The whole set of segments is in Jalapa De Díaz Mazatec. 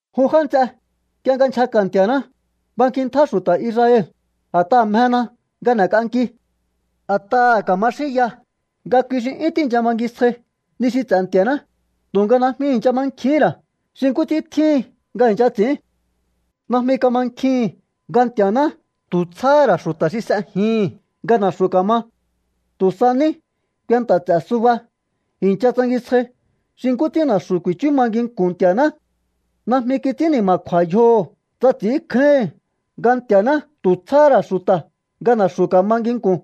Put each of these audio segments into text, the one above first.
Jun já nts'e, nk'ie nga nchjaka̱ Nti̱a̱ná, bankintjá xu̱ta̱ Israel, a̱t'aha̱ mjena nga n'e̱k'anki. A̱t'aha̱ ka̱ma xínya nga kui xi 'yún tíi̱ncha bangisjai ni xi ts'e̱ Nti̱a̱ná, tu̱nga najmi i̱ncha mankjihín ra̱ xi nkú ts'ín tjíhin nga i̱ncha ts'i̱ín. Najmi kamankjihi̱n nga Nti̱a̱ná tu̱ tsjáhá ra̱ xu̱ta̱ xi s'ejihi̱n nga na̱xu̱ ka̱ma. Tu̱ sa ní kuenta ts'e̱ suba i̱ncha tsangisjai xi nkú ts'ín na̱xu̱ ku̱i̱chú ma nginku̱n Nti̱a̱ná. Najmi kits'ín ni̱ma̱kju̱a̱ yjoho̱ tsa ts'i̱ínkjáíhi̱n nga Nti̱a̱ná tu̱ tsjáhá ra̱ xu̱ta̱ nga na̱xu̱ ka̱ma nginku̱n.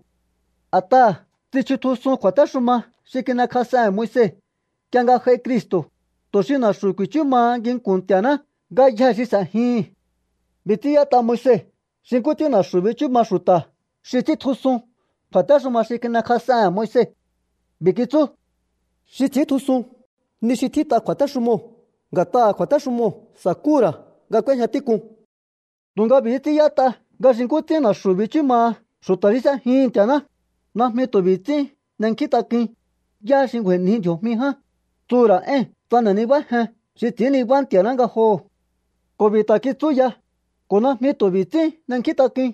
A̱t'aha̱ tsichutjusun kju̱a̱téxuma xi kin'ekjas'ehe̱n Moise nk'ie nga j'ai Cristo̱, tu̱ xi na̱xu̱ ku̱i̱chú maha nginku̱n Nti̱a̱ná ngayjee̱ xi s'e̱jihi̱n. B'i̱ ts'ín y'ét'a Moise xi nkú ts'ín na̱xu̱ bichú maha xu̱ta̱ xi ts'íntjusun kju̱a̱téxuma xi kin'ekjas'ehe̱n Moise. B'i̱ kitsú: “Xi ts'i̱íntjusun ni xi tjít'a kju̱a̱téxumoo̱, nga̱t'aha̱ kju̱a̱téxumoo̱ sa̱kúhu̱ ra̱ nga k'úéjña tík'un.” Tu̱nga b'i̱hí ts'ín y'ét'a ngá xi nkú ts'ín na̱xu̱ bichú maha xu̱ta̱ xi s'ejihi̱n Nti̱a̱ná: “Najmi tu̱ b'i̱ ts'ín n'enkjíntak'uin: ¿Yá xi ngju̱a̱i̱nji ndji̱o̱jmi ján?” Tsuhu̱ ra̱ éi̱n tsa n'e̱ nibájen xi ts'i̱ín niba Nti̱a̱ná ngajoho̱. Ko̱ b'i̱ ta̱ kitsú ya: “Ko̱ najmi tu̱ b'i̱ ts'ín n'enkjíntak'uin: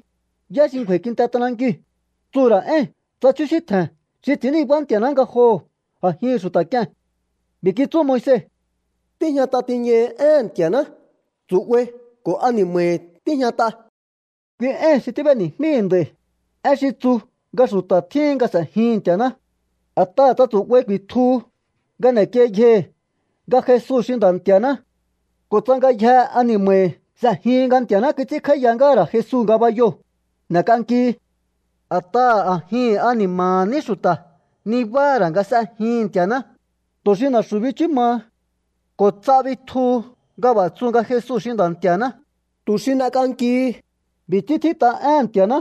¿Yá xi ngju̱a̱i̱ kinte t'anankiu̱?” Tsuhu̱ ra̱ éi̱n tsa chjúsíntje̱n xi ts'i̱ín niba Nti̱a̱ná ngajoho̱ a̱jihi̱n xu̱ta̱ k'ie̱n. B'i̱ kitsú Moise: “Tíjñat'a tiñahi éhe̱n Nti̱a̱ná, tsu̱'bai ko̱ ani̱ma̱hi̱ tíjñat'a.” Kui éi̱n xi tíb'eni̱jmíi̱ nd'a̱i̱, én xi tsu nga xu̱ta̱ tjíhin nga s'e̱jihi̱n Nti̱a̱ná. A̱t'aha̱ tsa tsu̱'bai ku̱i̱tjuhu nga n'e̱kiei yjohi̱ nga Jesu xi Nda̱ Nti̱a̱ná, ko̱ tsa ngayjehe ani̱ma̱hi̱ s'e̱jihin nga Nti̱a̱ná kits'ínkj'áíya ngáha̱ ra̱ Jesu ngabayoo̱, n'e̱k'ankihi. A̱t'aha̱ a̱jin ani̱ma̱ha̱ ní xu̱ta̱ nibáha̱ ra̱ nga s'ejihi̱n Nti̱a̱ná, tu̱ xi na̱xu̱ bichú maha. Ko̱ ts'a bitjuhu nga b'a̱ tsu nga Jesu xi Nda̱ Nti̱a̱ná, tu̱ xi n'ek'ankihi. B'i̱ ts'ín tjít'a éhe̱n Nti̱a̱ná: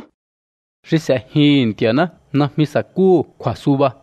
“Xi s'e̱jihi̱n Nti̱a̱ná najmi sa̱kúhu̱ kju̱a̱suba.”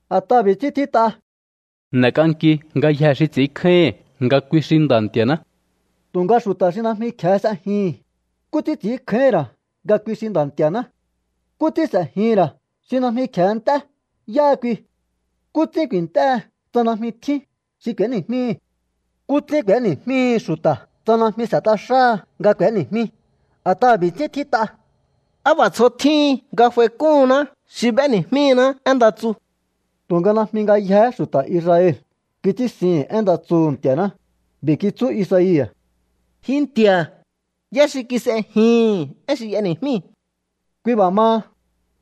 A̱t'aha̱ b'i̱ ts'ín tjít'a: “N'e̱k'anki ngayjee̱ xi ts'i̱ínkjáíhi̱n nga kui xi Nda̱ Nti̱a̱ná.” Tu̱nga xu̱ta̱ xi najmi kje̱e s'ejihi̱n, ¿nkú ts'ín ts'i̱ínkjáíhi̱n ra̱ nga kui xi Nda̱ Nti̱a̱ná? ¿Nkú ts'ín s'e̱jihi̱n ra̱ xi najmi kje̱e nt'é yáha kui? ¿Nkú ts'ín ku̱i̱nt'éhe tsa najmi tjín xi k'u̱éni̱jmíhi̱? ¿Nkú ts'ín k'u̱éni̱jmíhi xu̱ta̱ tsa najmi s'e̱t'a xáha nga k'u̱éni̱jmí? A̱t'aha̱ b'i̱ ts'ín tjít'a: “Á b'a̱ tsjo tjíhin nga f'aik'úhunná xi b'éni̱jmíná én nda tsu.” Tu̱nga najmi ngayjee̱hé xu̱ta̱ Israel kits'ínsihi̱n én nda tsuhu̱ Nti̱a̱ná. B'i̱ kitsú Isaia̱: “Ji Nti̱a̱, ¿yá xi kis'ejihi̱n én xi y'eni̱jmíi̱?” Kui b'a̱ maha,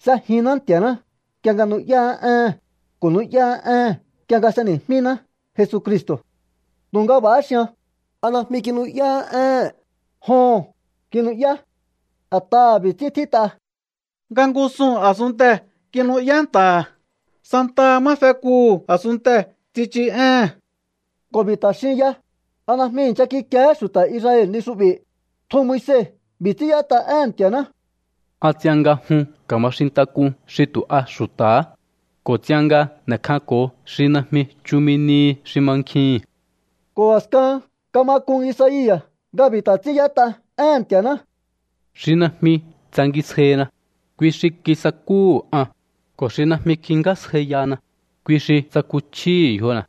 s'ejinná Nti̱a̱ná nk'ie nga nu'yáá éhe̱n, ko̱ nu'yáá ée̱n nk'ie nga s'eni̱jmíná Jesucristo̱. Tu̱nga b'a̱há xian: ¿A najmi kinu'yáhá ée̱n? Joho̱n, kinu'yá. A̱t'aha̱ b'i̱ ts'ín tjít'a: Nga ngúsuu̱n a̱sunntee̱ kinu'yá nta̱ha̱, santaha má fekuhu̱ a̱sunntee̱ tsichu éhe̱n. Ko̱ b'i̱ ta̱ xin ya: ¿A najmi i̱ncha kikiehé xu̱ta̱ Israel ni xu'bi̱? Tjun Moise b'i̱ ts'ín y'ét'a éhe̱n Nti̱a̱ná: An ts'ian nga jun ka̱ma xintak'un xi tu̱ a xu̱ta̱há, ko̱ ts'ian nga n'e̱kjanko̱o xi najmi chumi nihi xi mankjihi̱n. Ko̱ a̱skahan kama k'un Isaia̱ nga b'i̱ ta̱ ts'ín y'ét'a éhe̱n Nti̱a̱ná: Xi najmi tsangisjaina, kui xi kisakúhu̱ an, ko̱ xi najmi kingjásjaiyana, kui xi tsakuchjíhi̱ yjona̱.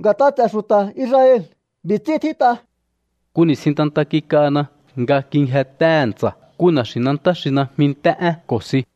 Nga̱t'a ts'e̱ xu̱ta̱ Israel b'i̱ ts'ín tjít'a: “Nku ni̱stjin ntanta kik'ana nga kingjentéhe̱ ntsa̱ nku na̱xi̱nantá xi najmi nt'é'én ko̱ si.”